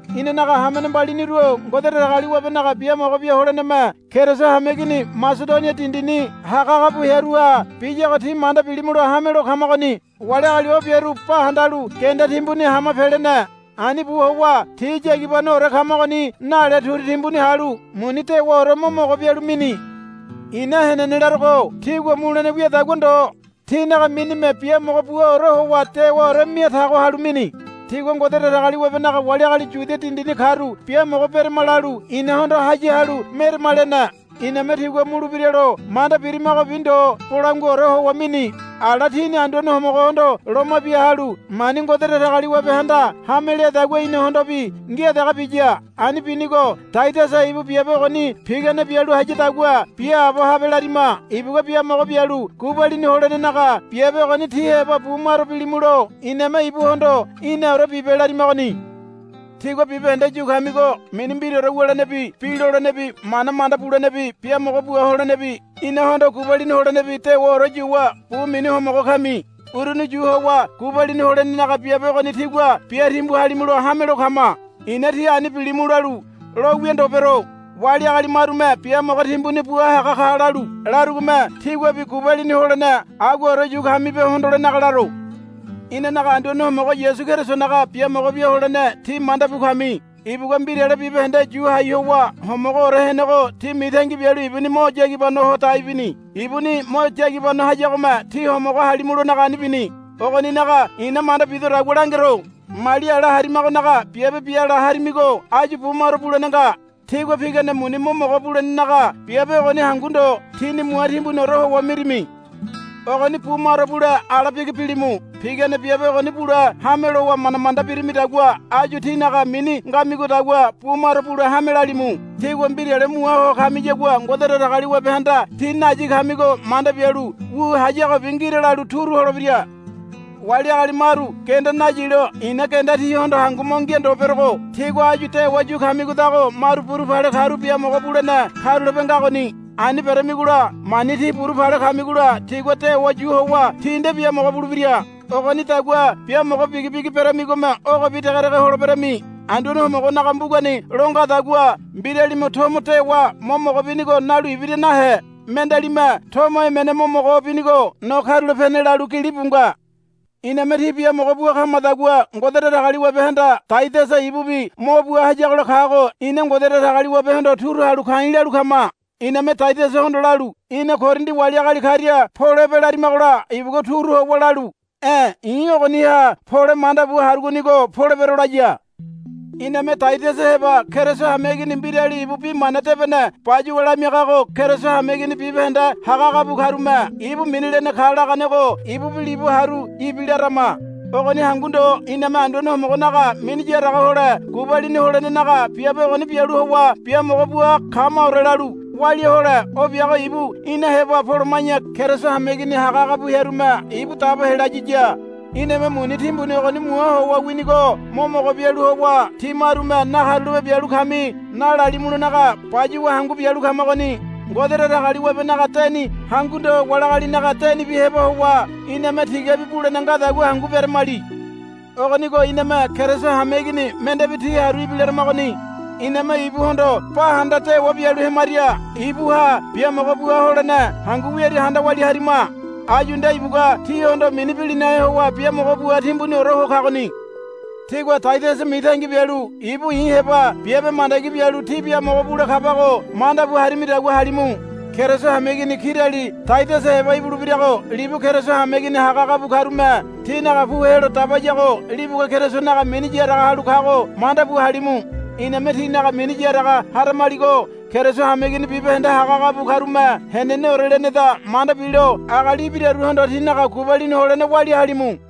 Inanaga hamene mbaliniru-o Ngode Datagaliwabenaga biamogo bia holeneme Keriso hameigini Masedonia dindini hagahaga bu hearuha biyago tí manda bilimulo hamelo kamagoni. Wali agali o biaru ba handalu genda timbuni hama pelene. Ani bu howa ti yagibanoore kamagoni nale turu timbuni halu muni dewaore mo mogo bialu mini. I̱na henene larogo tigua mulene wiadagua ndo tinaga minime biamogo buaore howa dewaore mia tago halu mini. Tigua Ngode Datagaliwabenaga wali agali Yudia dindini karu biamogo berama, lalu inahondo haya halu, Merama, lene. Iname tigua mulebira lo manda birimagobi ndo bolanguaore howa mini. Ala tini Anduane Homogohondo loma bia halu mani Ngode Datagaliwabehanda hame leadagua inahondobi ngia dege biya. Ani binigo Taidasa ibu biabe ogoni pigane bialu hayadagua biaabo habe larima. Ibugua biamogo bialu gubalini holenenaga biabe ogoni tí heba bu maro bilimulo iname ibuhondo, Í̠naore bibe, larimagoni. Tígua bibahende yu kamigo mini mbiraore wulenebi bi lolenebi mana manda bulenebi biamogo bua holenebi inahondo gubalini holenebi dewaore yuwa bu mini homogo kami. Uruni yu howa gubalini holenenaga biabe ogoni tígua bia timbu halimulo hamelo kama. I̱na tí ani bilimu lalu lo wia ndo bero. Wali agali marume biamogo timbuni bua haga ka lalu larugome tíguabi gubalini holene aguaore yu kamibe hondolenaga laro. Inanaga Anduane Homogo Yasu Kerisonaga biamogo bia holene tí manda bu kami. Ibugua mbirale bibahende yu hai howa homogoore henego tí mitangi bialu ibuni mo yagibano ho dai bini. Ibuni mo yagibano hayagome tí homogo halimulonaga ani bini. Ogoninaga i̱na manda bidodagua langero. Mali ala harimagonaga biabe biala harimigo áyu bu maro bulene nga. Tígua pigane muni mo mogo bulenenaga biabe ogoni hangu ndo tíni mua timbuniore howa mirimi. Ogoni bu maro bule ala bigi bilimu. Pigane biabe ogoni bule hame lowa manda manda birimidagua áyu tínaga mini ngamidagua bu maro bule hame lalimu. Tígua mbirale mua ho kamiyagua Ngode Datagaliwabehanda tí nayi kamigo manda bialu wu hayagobi ngira lalu turu holebira. Wali agali maru genda nayilo i̱na genda tíhondo hangu mo ngia ndo berogo tígua áyu dewa yu kamigodago maru burupale karu biamogo bulene karulape ngagoni. Ani beramigola mani tí burupale kamigola tigua dewa yu howa tí nde biamogo bulebira. Ogonidagua biamogo bigibigi beramigome ogobi degedege holeberami. Anduane Homogonaga mbugani lo ngadagua, Mbiralime tomo dewa mo mogo binigo nalu ibira nahe. Mendealime tomo emene mo mogo binigo no karulapene, lalu gilibu nga. Iname tí biamogo bua kamadagua Ngode Datagaliwabehanda Taidasa ibubi mo bua hayagola kago ina Ngode Datagaliwabehondo turu halu ka̱i̱ lalu kama. Iname Taidasahondo lalu, Í̠na Korindi wali agali karia polebe, larimagola ibugua turu howa lalu, E̱ i̱ ogoniha pole manda bu harugonigo polebero, laya. Iname Taidasa heba Keriso hameigini mbirali ibu bi mana debene bayuwa lamiagago Keriso hameigini bibahende hagahaga bu karume, Ibu mini lene ka, laganego ibubi libu haru ibilarama. Ogoni hangu ndo iname Anduane Homogonaga mini yaraga hole gubalini holenenaga biabe ogoni bialu howa biamogo bua kamaore lalu walia hole o biago ibu ina heba poloma̱ya Keriso hameigini hagahaga bu hearume ibu dabo helayiya. Iname muni timbuni ogoni mua howa winigo mo mogo bialu howa tí marume, Nakarulape bialu kami, nalalimulonaga bayuwa hangu bialu kamagoni. Ngode Datagaliwabenaga deni hangu ndo wali agalinaga denibi heba howa iname tigabi bulene ngadagua hangu beremali. Ogonigo iname Keriso hameigini mendebi ti haru ibilaramagoni. Iname ibuhondo ba handa dewa bialu hemaria ibuha biamogo bua holene hangu wiaria handa walia harima. Áyu nde ibugua tíhondo mini bilinahe howa biamogo bua timbuniore ho kagoni. Tígua Taidasa mitangi bialu ibu i̱ heba biabe mandagi bialu tí biamogo bule kabago mandabu harimidagua halimu. Keriso hameigini kirali Taidasa heba ibulebirago libu Keriso hameigini hagahaga bu karume tinaga pu helo dabayago libugua Kerisonaga mini yaraga halu kago manda bu halimu. Iname tínaga mini yaraga haramaligo Keriso hameigini bibahende hagahaga bu karume heneneore leneda manda bilo agali ibiraruhondo tínaga gubalini holene walia halimu.